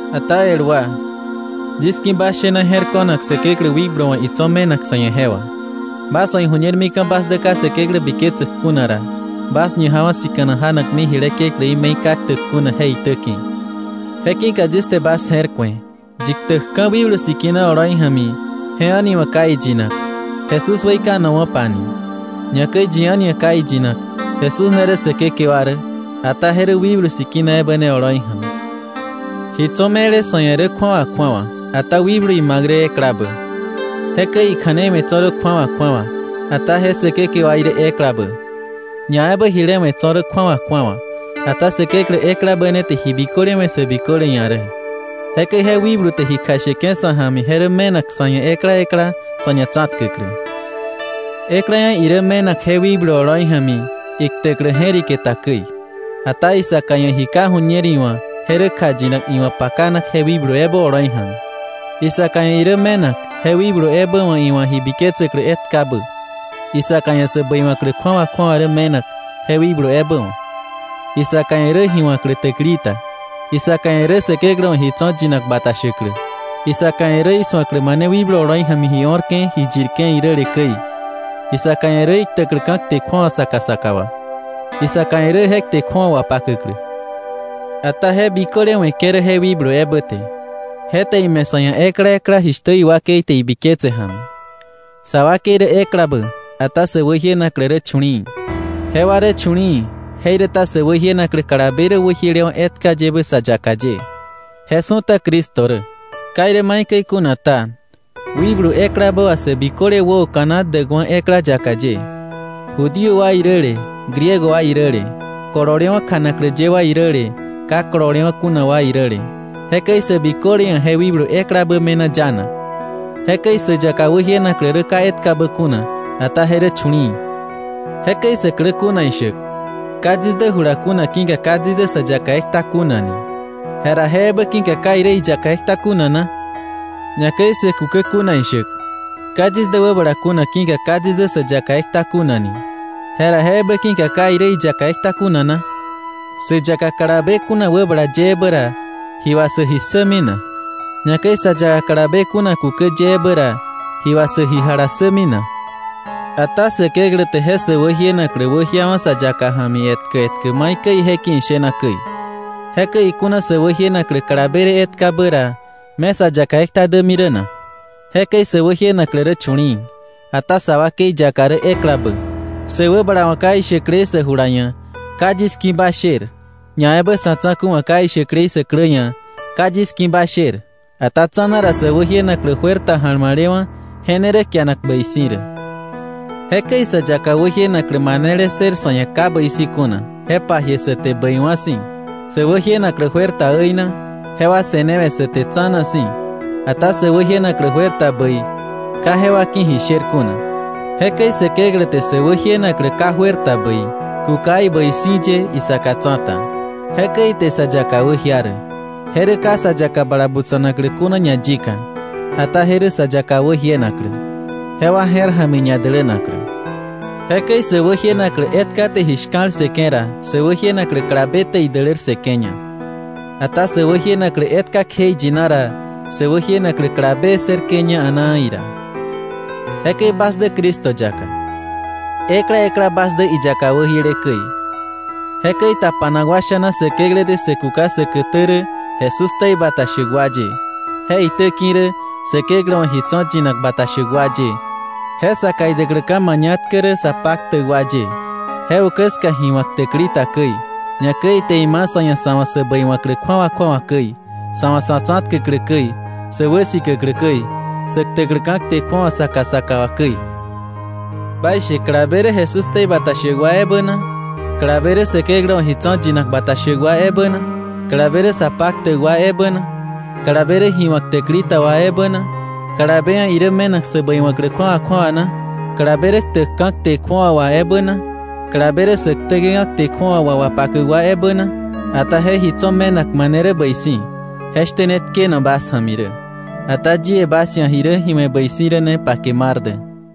Ata el wa, yis ki̱ bas shena je̱r ko̱nak Säkeklä wikblu wa̱ itso̱ me̱nak sa̱ ia̱ je wà. Bas wa̱ iju̱ñer mika̱ bas dä ka Säkeklä biketsäk kuna ra, bas ñajawa̱ sika̱nak janakmi jile kekläí me̱i ka ktäk kuna je itäki̱. Je ki̱ka yis te bas je̱r ku̱e, yi ktäkka̱ Wikblu Sikina oloi ja̱mi je a̱ni wa̱ ka iyinak: “Jesús weikanowa̱pa” ni, ñakäi yi a̱ni ia̱ ka iyinak: “Jesús ne rä Säkekewa rä”, ata je rä Wikblu Sikina ebä ne oloi ja̱mi. Ji tso̱ me̱le sa̱ ia̱ rä kju̱awa kju̱awa, ata wikblu ima̱k rä eklabä. Jekäi ikja̱nei we̱ tso̱ rä kju̱awa kju̱awa, ata je Säkekewaí rä eklabä. Ñaebä jile we̱ tso̱ rä kju̱awa kju̱awa, ata Säkeklä eklabä ne te ji biköle we̱ sä biköle ia̱ rä. Jekäi je wikblu te ji kjasheke̱ sa̱ ja̱mi je rä me̱nak sa̱ ia̱ ekla ekla sa̱ ñatsa̱tkäklä. Ekla ia̱ irä me̱nak je wikblu oloi ja̱mi iktäklä je̱rike ta käi, ata isaka ia̱ ji ka ju̱ñer iwa̱ je rä kjayinak iwa̱ pakanak je wikblu ebä oloi ja̱mi. Isaka ia̱ irä me̱nak je wikblu ebä wa̱ iwa̱ ji biketsäklä etkabä, isaka ia̱ sä bäiwa̱klä kju̱awa kju̱awa rä me̱nak je wikblu ebä wa̱, isaka ia̱ rä ji wa̱klä täkili ta, isaka ia̱ rä Säkeklä wa̱ ji tso̱ yinak bata shäklä, isaka ia̱ rä isu̱aklä mane wikblu oloi ja̱mi ji o̱rke̱ ji yirke̱ iräle käi, isaka ia̱ rä iktäkläka̱ kte kju̱awa saka saka wà, isaka ia̱ rä je kte kju̱awa wapakäklä. Ata je biköle we̱ke̱ rä je wikblu ebä te; je te ime̱ sa̱ ia̱ ekla ekla jishtä iwakei te ibiketse ja̱mi. Sa wakei rä eklabä, ata sä wäjienaklä rä chu̱li̱i̱. Jewa rä chu̱li̱i̱, jeiräta sä wäjienaklä kalabe rä wäjielewa̱ etkayebä sä yaka ye. Je su̱ta Cristo rä. Ka irä maikäi kuna ta, wikblu eklabä wà sä biköle wäoka̱na däkwa̱ ekla yaka ye, Judío wa iräle Griego wa iräle, kololewa̱ kjanaklä ye wa iräle ka kololewa̱ kuna wa iräle, jekäi sä biköle ia̱ je wikblu eklabä me̱na yanak. Jekäi sä yaka wäjienaklä rä ka etkabä kuna, ata je rä chu̱li̱i̱. Jekäi sä klä kuna ishäk: “Ka yis dä jula kuna ki̱ka ka yis dä sä yaka ekta kuna” ni, jera ¿je ebä ki̱ka ka irä iyaka ekta kuna na? Ñakäi sä kukä kuna ishäk: “Ka yis dä wäbala kuna ki̱ka ka yis dä sä yaka ekta kuna” ni, jera ¿je ebä ki̱ka ka irä iyaka ekta kuna na? Sä yaka kalabe kuna wäbala ye ebä ra, ¿ji wà sä ji ssämi na? Ñakäi sa yaka kalabe kuna kukä ye ebä ra, ¿ji wà sä ji jalassämi na? Ata Säkeklä te je sä wäjienaklä wäjiawa̱ sa yaka ja̱mi etkä etkä maikäi ije ki̱ ishena käi. Jekäi ikuna sä wäjienaklä kalabe rä etkabä ra, ¿me sa yaka ekta dämi rä na? Jekäi sä wäjienaklä rä chu̱li̱i̱, ata sa wakei yaka rä eklabä. Sä wäbala wa̱ ka ishäklei sä jula ia̱: “Ka yis ki̱ ba sher.” Ñaebä sa̱ tsa̱ku̱ wa̱ ka ishäklei sä klä ia̱: “Ka yis ki̱ ba sher.” Ata tsa̱na ra, sä wäjienaklä juer ta ja̱lma̱lewa̱, je ne rä kianak bäi si̱ rä. Jekäi sä yaka wäjienaklä manele ssër sa̱ ia̱ ka bäi si̱ kuna, je pajie sä te bäiwa̱ si̱. Sä wäjienaklä juer ta äina, jewa se̱newe̱ sä te tsa̱na si̱. Ata sä wäjienaklä juer ta bäi, ka jewa ki̱ ji sher kuna. Jekäi Säkeklä te sä wäjienaklä ka juer ta bäi kuka ibäi si̱ ye isaka tsa̱ta. Jekäi ite sä yaka wäjia rä. Je rä ka sa yaka bala butsa̱naklä kuna ñayika, ata je rä sä yaka wäjienaklä, jewa je̱r ja̱mi ñadälänaklä. Jekäi sä wäjienaklä etka te ji shka̱l ssëke̱ ra, sä wäjienaklä kalabe te idälär ssëke̱ña. Ata sä wäjienaklä etka kjeiyina ra, sä wäjienaklä kalabe ssërke̱ña a̱naa ira. Jekäi bas dä Cristo yaka. Ekla ekla bas dä iyaka wäjiele käi. Jekäi tapanak wa sha̱na Säkeklä te sä kuka säkätä rä Jesús ktei bata shäk wa ye, je itäki̱ rä Säkeklä wa̱ ji tso̱ yinak bata shäk wa ye, je saka idäkläka̱ mañatkä rä sa paktäk wa ye, je ukä ska ji wa̱k täkili ta käi, ñakäi ite ima̱ sa̱ ia̱ sa̱ wa̱ sä bäiwa̱klä kju̱awa kju̱awa käi, sa̱ wa̱ sa̱ tsa̱tkäklä käi, sä wäsikäklä käi, sä ktäkläka̱ kte kju̱awa saka saka wa käi. ¿Baishe, kalabe rä Jesús ktei bata shäk wa ebä na? Kalabe rä Säkeklä wa̱ ji tso̱ yinak bata shäk wa ebä na? ¿Kalabe rä sa paktäk wa ebä na? ¿Kalabe rä ji wa̱k täkili ta wa ebä na? ¿Kalabe ia̱ irä me̱nak sä bäiwa̱klä kju̱awa kju̱awa na? ¿Kalabe rä ktäkka̱ kte kju̱awa wà ebä na? ¿Kalabe rä sä ktäke̱ka̱ kte kju̱awa wà wapakäk wa ebä na? Ata je ji tso̱ me̱nak mane rä bäi si̱, je shtä ne tkeno bas ja̱mi rä. Ata yie bas ia̱ ji rä ji we̱ bäi si̱ rä ne pake mar dä.